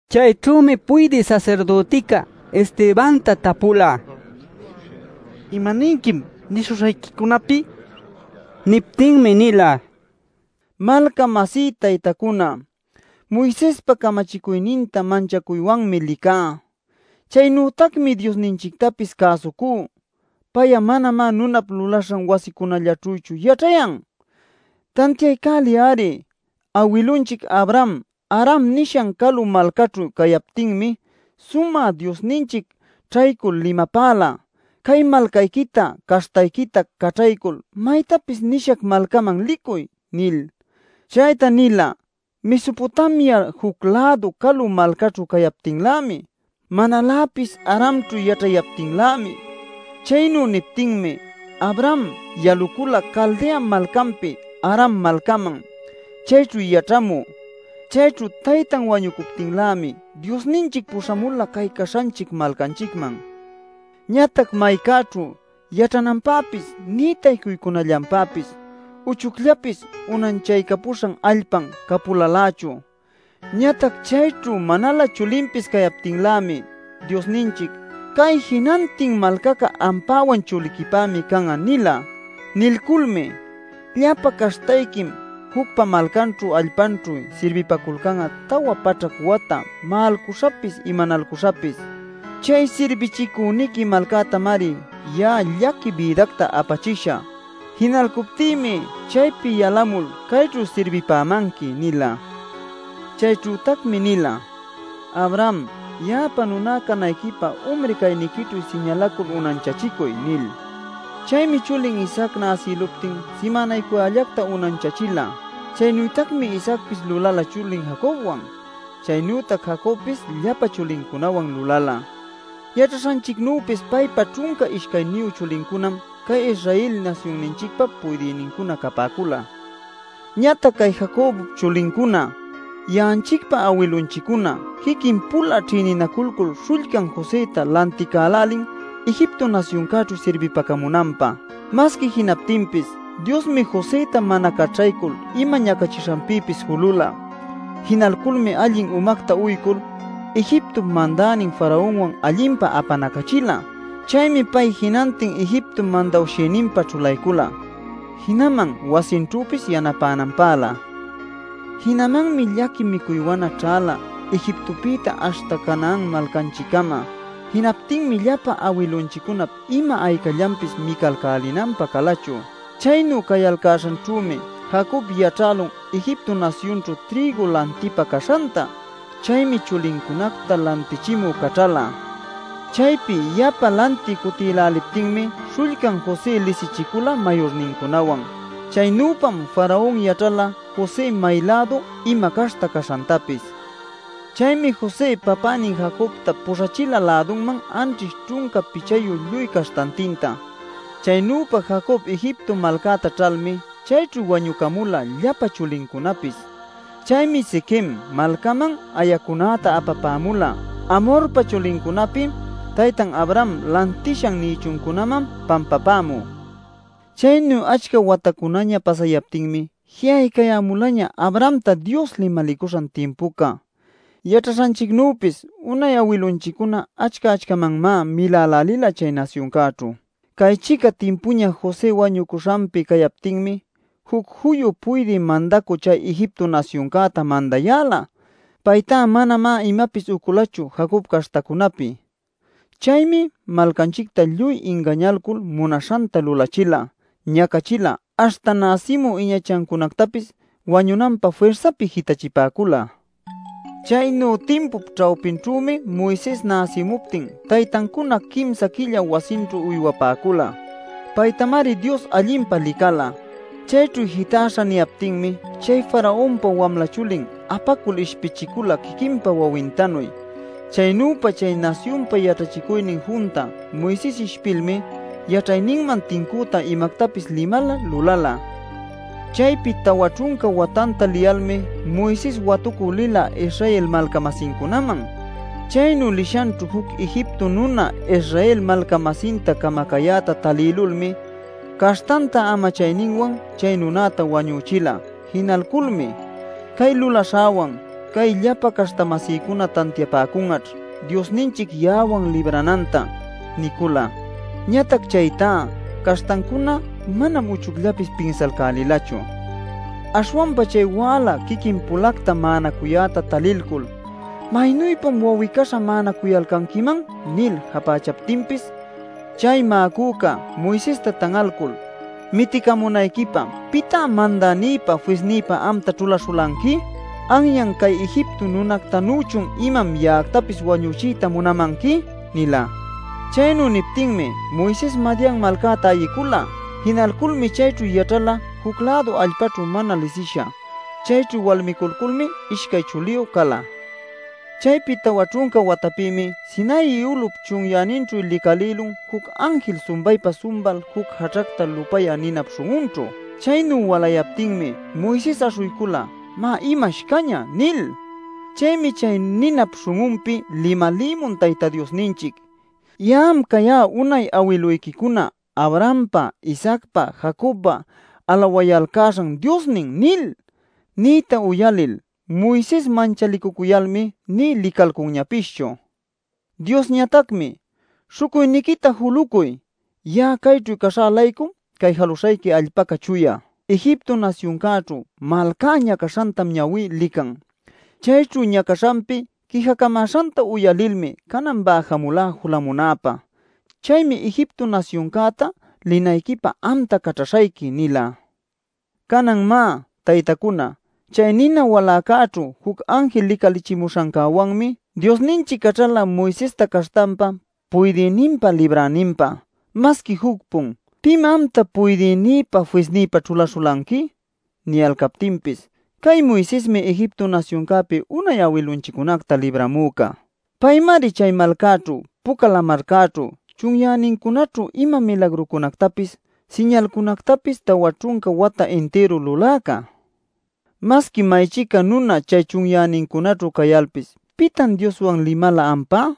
Chayćhümi puydï sasirdütica Estebanta tapula: “¿Imaninquim nishuśhayquicunapi?” nil. Niptinmi nila: “Malca-masí taytacuna, [Moisespa camachicuyninta manchacuywanmi licá. Chaynütacmi Diosninchictapis cäsucú. Pay'a manamá nunap lulaśhan wasicunallaćhüchu yaćhayan.] Tantiaycäliy-ari. Awilunchic Abraham Haram nishan calu malcaćhu cayaptinmi Sumä Diosninchic ćhaycul limapäla: ‘Cay malcayquita, caśhtayquita caćhaycul maytapis nishac malcaman licuy’ nil. Chayta nila Mesopotamia juc-lädu calu malcäćhu cayaptinlämi, manaläpis Haramćhu yaćhayaptinlämi. Chaynu niptinmi Abraham yalucula Caldea malcanpi Haram malcäman chayćhu yaćhamü. Chayćhu taytan wañucuptinlämi Diosninchic puśhamula cay caśhanchic malcanchicman. Ñatac maycäćhu yaćhananpäpis nï taycuycunallanpäpis uchucllapis unanchaycapuśha allpan capulalächu. Ñatac chayćhu manalä chulinpis cayaptinlämi Diosninchic: ‘Cay jinantin malcaca ampäwan chuliquipämi can'a’ nila. Nilculmi: ‘Llapa caśhtayquim jucpa malcanćhu allpanćhu sirbipaculcan'a tawa paćhac wata ma'alcuśhapis, imanalcuśhapis. Chay sirbichicüniqui malcätamari ya'a llaqui bïdacta apachishä. Jinalcuptïmi chaypi yalamul cayćhu sirbipämanqui’ nila. “Chayćhütacmi nila: ‘Abraham ya'apa nuná canayquipä umri cayniquićhu siñalacul unanchachicuy’ nil. Chaymi chulin Isaac näsïluptin simänaycuyällacta unanchachila. Chaynütacmi Isaacpis lulala chulin Jacobwan. Chaynütac Jacobpis llapa chulincunawan lulala. Yaćhaśhanchicnüpis paypa ćhunca ishcayniyu chulincunam cay Israel nasyunninchicpa puydïnincuna capäcula. “Ñatac cay Jacobpa chulincuna, ya'anchicpa awilunchiccuna, quiquin-pula ćhïninaculcul śhullcan Josëta lanticälälin Egipto nasyuncäćhu sirbipacamunanpä. Masqui jinaptinpis Diosmi Josëta mana caćhaycul ima ñacaśhanpïpis julula. Jinayculmi allin umacta uycul, Egiptop mandänin Faraonwan allinpa apanacachila. Chaymi pay jinantin Egiptop mandawshïninpä ćhulaycula jinaman wasinćhüpis yanapänanpälä. “Jinamanmi llaqui micuy wana ćhäla Egiptopïta aśhta Canaan malcanchiccama. Jinaptinmi llapa awilunchiccunap ima aycallapis micalcälinanpä calachu. Chaynu cayalcäśhanćhümi Jacob yaćhälun Egipto nasyunćhu trïgu lantiypä caśhanta. Chaymi chulincunacta lantichimü caćhala. Chaypi yapa lantï cutïläliptinmi śhullcan José lisichicula mayurnincunawan. Chaynüpam Faraon yaćhala José may-lädu, ima caśhta caśhantapis. Chaymi José papänin Jacobta puśhachila lädunman anćhish ćhunca pichayu lluy caśhtantinta. Chaynüpa Jacob Egipto malcäta ćhalmi chayćhu wañucamula llapa chulincunapis. Chaymi Siquem malcaman ayäcunäta apapämula Hamorpa chulincunapi taytan Abraham lantishan nïchuncunaman pampapämü. “Chaynu achca watacunaña pasayaptinmi ji'aycayämulaña Abrahamta Dios limalicuśhan timpuca. Yaćhaśhanchicnüpis unay awilunchiccuna achca-achcamanmá milälälila chay nasyuncäćhu. Cay-chica timpuña José wañucuśhanpi cayaptinmi juc juyu puydï mandacü chay Egipto nasyuncäta mandayäla. Paytá manamá imapis uculachu Jacobpa caśhtacunapi. Chaymi malcanchicta lluy ingañalcul munaśhanta lulachila, ñacachila, aśhta näsimü iñachancunactapis wañunanpä firsapi jitachipäcula. Chaynu timpup ćhawpinćhümi Moises näsimuptin taytancuna quimsa quillalä wasinćhu uywapäcula. Paytamari Dios allinpa licala. Chayćhu jitäśha niyaptinmi chay Faraonpa wamla chulin apacul ishpichicula quiquinpa wawintanuy. Chaynüpa chay nasyunpa yaćhachicuynin junta Moises ishpilmi yaćhayninman tincüta imactapis limala, lulala. “Chaypi tawa ćhunca watanta liyalmi, Moises watucü lila Israel malca-masincunaman. Chaynu lishanćhu juc Egipto nuna Israel malca-masinta camacayäta talïlulmi caśhtanta amachayninwan chay nunäta wañuchila. Jinalculmi: ‘Cay lulaśhäwan cay llapa caśhta-masïcuna tantiapäcun'aćh Diosninchic ya'awan librananta’ nicula. Ñatac chaytá caśhtancuna manam uchucllapis pinsalcälilachu. Aśhwanpa chay wäla quiquin-pulacta ma'anacuyäta talilcul: ‘¿Maynüpam wawi-caśha ma'anacuyalcanquiman?’ nil japächaptinpis chay ma'acüca Moisesta tan'alcul ‘¿Miticamunayquipä pitá mandänïpä, fisnïpä amta ćhulaśhulanqui? ¿Anyan cay Egipto nunactanüchun imam ya'actapis wañuchiyta munamanqui?’ nila. “Chaynu niptinmi, Moises Madian malcäta ayicula. Jinalculmi chayćhu yaćhala juc-lädu allpaćhu mana lisisha. Chayćhu walmiculculmi ishcay chuliyu cala. “Chaypi tawa ćhunca watapïmi Sinai ulup chunyäninćhu licalïlun juc anjil sumbaypa-sumbal juc jaćhacta lupayä ninap śhun'unćhu. Chaynu walayaptinmi Moises aśhuycula ‘¿Má, imash cañä?’ nil. “Chaymi chay ninap śhun'unpi limalïmun Tayta Diosninchic: ‘Ya'am cayá unay awiluyquicuna Abrahampa, Isaacpa, Jacobpa alawayalcäśhan Diosnin’ nil. Niyta uyalil Moises manchalicucuyalmi, nï licalcunñapischu. Diosñatacmi: ‘Śhucuyniquita julucuy. Ya'a cayćhu caśhä-laycum cay jaluśhayqui allpaca chuya. Egipto nasyuncäćhu malcá ñacaśhantam ñawí lican. Chayćhu ñacaśhanpi quijacamäśhanta uyalilmi canan bäjamulá julamunäpä. Chaymi Egipto nasyuncäta linayquipä amta caćhaśhayqui’ nila. “Canan má, taytacuna, chay nina waläcäćhu juc anjil licalichimuśhancäwanmi Diosninchic caćhala Moisesta caśhtanpa puydïninpä, libräninpä. Masqui juc-pun ‘¿Pim amta puydïnïpä, fisnïpä ćhulaśhulanqui?’ niyalcaptinpis cay Moisesmi Egipto nasyuncäpi unay awilunchiccunacta libramüca. Paymari chay malcäćhu, Puca Lamarcäćhu, chunyänincunäćhu ima milagrucunactapis, siñalcunactapis tawa ćhunca wata intiru luläca. “Masqui may-chica nuna chay chunyänincunäćhu cayalpis ¿pitan Dioswan limala ampá?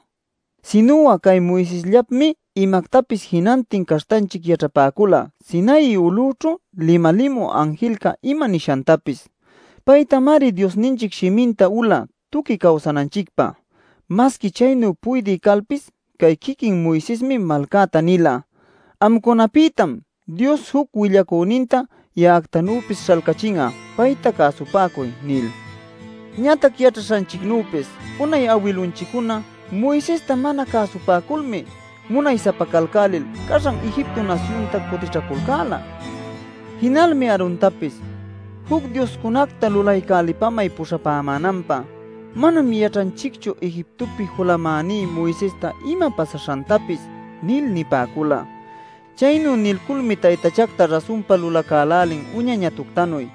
Sinu'a cay Moisesllapmi imactapis jinantin caśhtanchic yaćhapäcula Sinai ulućhu limalimü anjilca ima nishantapis. Paytamari Diosninchic shiminta ula tuqui cawsananchicpä. Masqui chaynu puydï calpis cay quiquin Moisesmi malcäta nila: ‘Amcunapïtam Dios juc willacüninta ya'actanüpis śhalcachin'a. Payta cäsupäcuy’ nil. “Ñatac yaćhaśhanchicnüpis unay awilunchiccuna Moisesta mana cäsupäculmi munay-sapacalcälil caśhan Egipto nasyunta cutićhaculcäla. Jinalmi Aarontapis: ‘Juc dioscunacta lulaycälipamay puśhapämänanpä. Manam yaćhanchicchu Egiptopi julamäní Moisesta ima pasaśhantapis’ nil nipäcula. Chaynu nilculmi taytachacta rasunpa lulacälälin uña ñatuctanuy.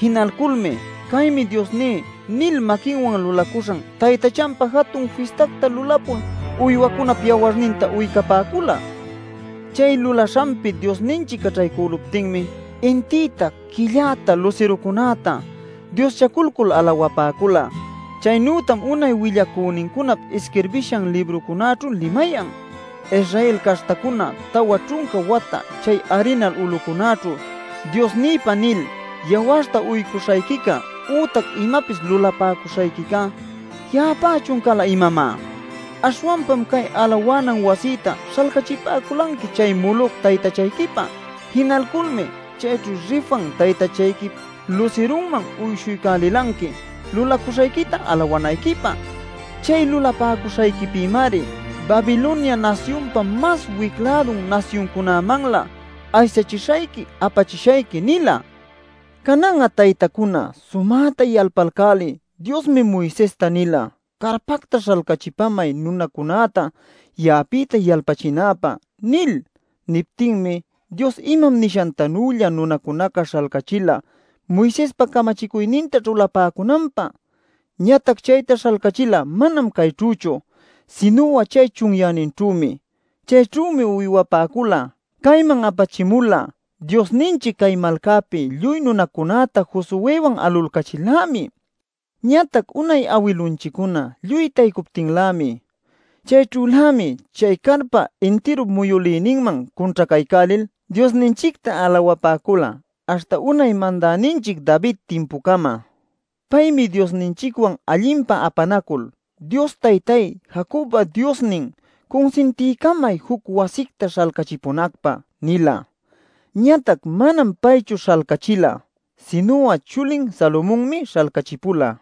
Jinalculmi ‘¡Caymi diosní!’ nil maquinwan lulacuśhan taytachanpä jatun fistacta lulapul uywacunap yawarninta uycapäcula. Chay lulaśhanpi Diosninchic caćhaycüluptinmi intïta, quilläta, lusirucunäta dioschaculcul alawapäcula. Chaynütam unay willacünincunap isquirbishan librucunäćhu limayan: ‘Israel caśhtacuna, tawa ćhunca wata chay arinal ulucunäćhu “Diosnïpä” nil yawarta uycuśhayquica ütac imapis lulapäcuśhayquica ¿ya'apächun cala, imamá? Aśhwanpam cay alawanan wasïta śhalcachipäculanqui chay Moloc taytachayquipä. Jinalculmi chayćhu Refan taytachayquip lusirunman uyshuycälilanqui lulacuśhayquita alawanayquipä. Chay lulapäcuśhayquipïmari Babilonia nasyunpa mas wic-lädun nasyuncunamanlä aysachishayqui, apachishayqui’ nila. “Canan'a, taytacuna, sumäta yalpalcäliy: Diosmi Moisesta nila: ‘Carpacta śhalcachipamay nunacunäta ya'apïta yalpachinäpä’ nil. Niptinmi Dios imam nishantanülla nunacunaca śhalcachila Moisespa camachicuyninta ćhulapäcunanpä. Ñatac chayta śhalcachila manam cayćhüchu sinu'a chay chunyäninćhümi. Chayćhümi uywapäcula. Cayman apachimula Diosninchic cay malcapi lluy nunacunäta Josuëwan alulcachil-lämi, ñatac unay awilunchiccuna lluy taycuptinlämi. Chayćhülämi chay carpap intiru muyülïninman cunćhacaycälil Diosninchicta alawapäcula aśhta unay mandäninchic David timpucama. Paymi Diosninchicwan allinpa apanacul: ‘Dios Taytáy, Jacobpa Diosnin, cunsintiycamay juc wasicta śhalcachipunacpä’ nila. Ñatac manam paychu śhalcachila sinu'a chulin Salomonmi śhalcachipula.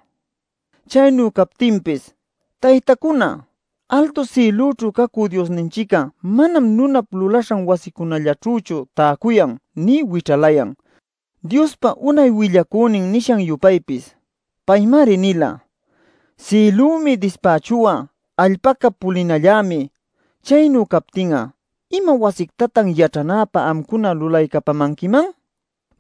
Chaynu captinpis, taytacuna, altu sïlućhu cacü Diosninchic'a manam nunap lulaśhan wasicunallaćhüchu täcuyan nï wićhalayan, Diospa unay willacünin nishan-yupaypis. Paymari nila: ‘Sïlümi dispächu'a, allpäcá pulinallämi. Chaynu captin'a ¿ima wasictatan yaćhanäpä amcuna lulaycapamanquiman?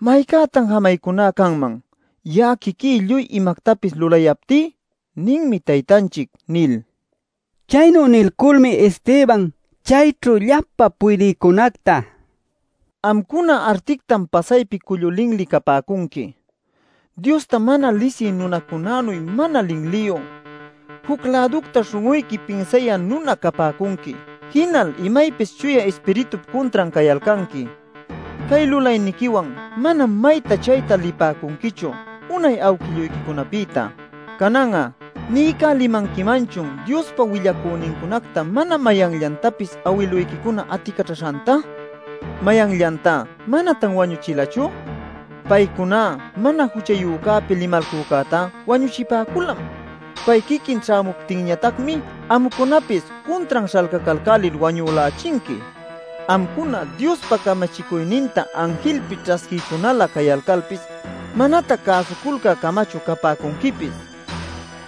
¿Maycätan jamaycuná canman, ya'a quiquí lluy imactapis lulayaptí?’ ninmi Taytanchic” nil. Chaynu nilculmi Esteban chayćhu llapa puydïcunacta: “Amcuna artictam pasaypi cullu linli capäcunqui. Diosta mana lisï nunacunänuy mana linliyu, juc-läducta śhun'uyqui pinsayä nuna capäcunqui. Jinal imaypis Chuya Ispiritup cuntran cayalcanqui. Cay lulayniquiwan manam mayta-chayta lipäcunquichu unay awquilluyquicunapïta. “Canan'a ¿niycälimanquimanchun Diospa willacünincunacta mana mayanllantapis awiluyquicuna aticaćhaśhanta? ¿Mayanllantá manatan wañuchilachu? Paycuná Mana Juchayücäpi limalcücätá wañuchipäculam. Pay quiquin ćhämuptinñatacmi, amcunapis cuntran śhalcalcälil wañülächinqui. Amcuna Diospa camachicuyninta anjilpi ćhasquïcunalä cayalcalpis manatac cäsuculcä-camachu capäcunquipis” nin.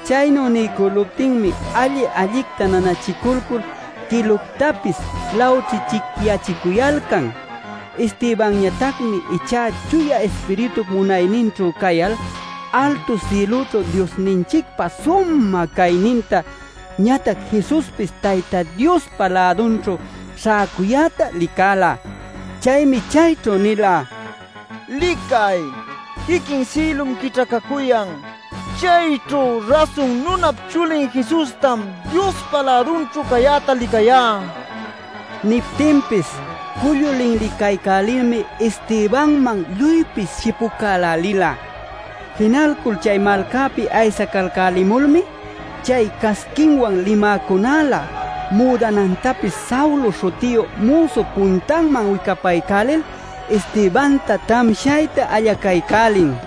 Chaynu niycüluptinmi alli-allicta nanachiculcul quiluctapis lawćhićhicyachicuyalcan. Estebanñatacmi ichá Chuya Ispiritup munayninćhu cayal altu sïlućhu Diosninchicpa sumä cayninta, ñatac Jesuspis Tayta Diospa lädunćhu śhäcuyäta licäla. Chaymi chayćhu nila: “¡Licay! Quiquin sïlum quićhacacuyan. Chayćhu Rasun Nunap Chulin Jesustam Diospa lädunćhu cayäta licayá” nil. Niptinpis cullu linlicaycälilmi Estebanman lluypis shipucälälila. Jinalcul chay malcapi aysacalcälimulmi chay casquinwan limäcunälä müdanantapis Saulo śhutiyu müsup puntanman wicapaycälil Estebanta tamshayta allacaycälin.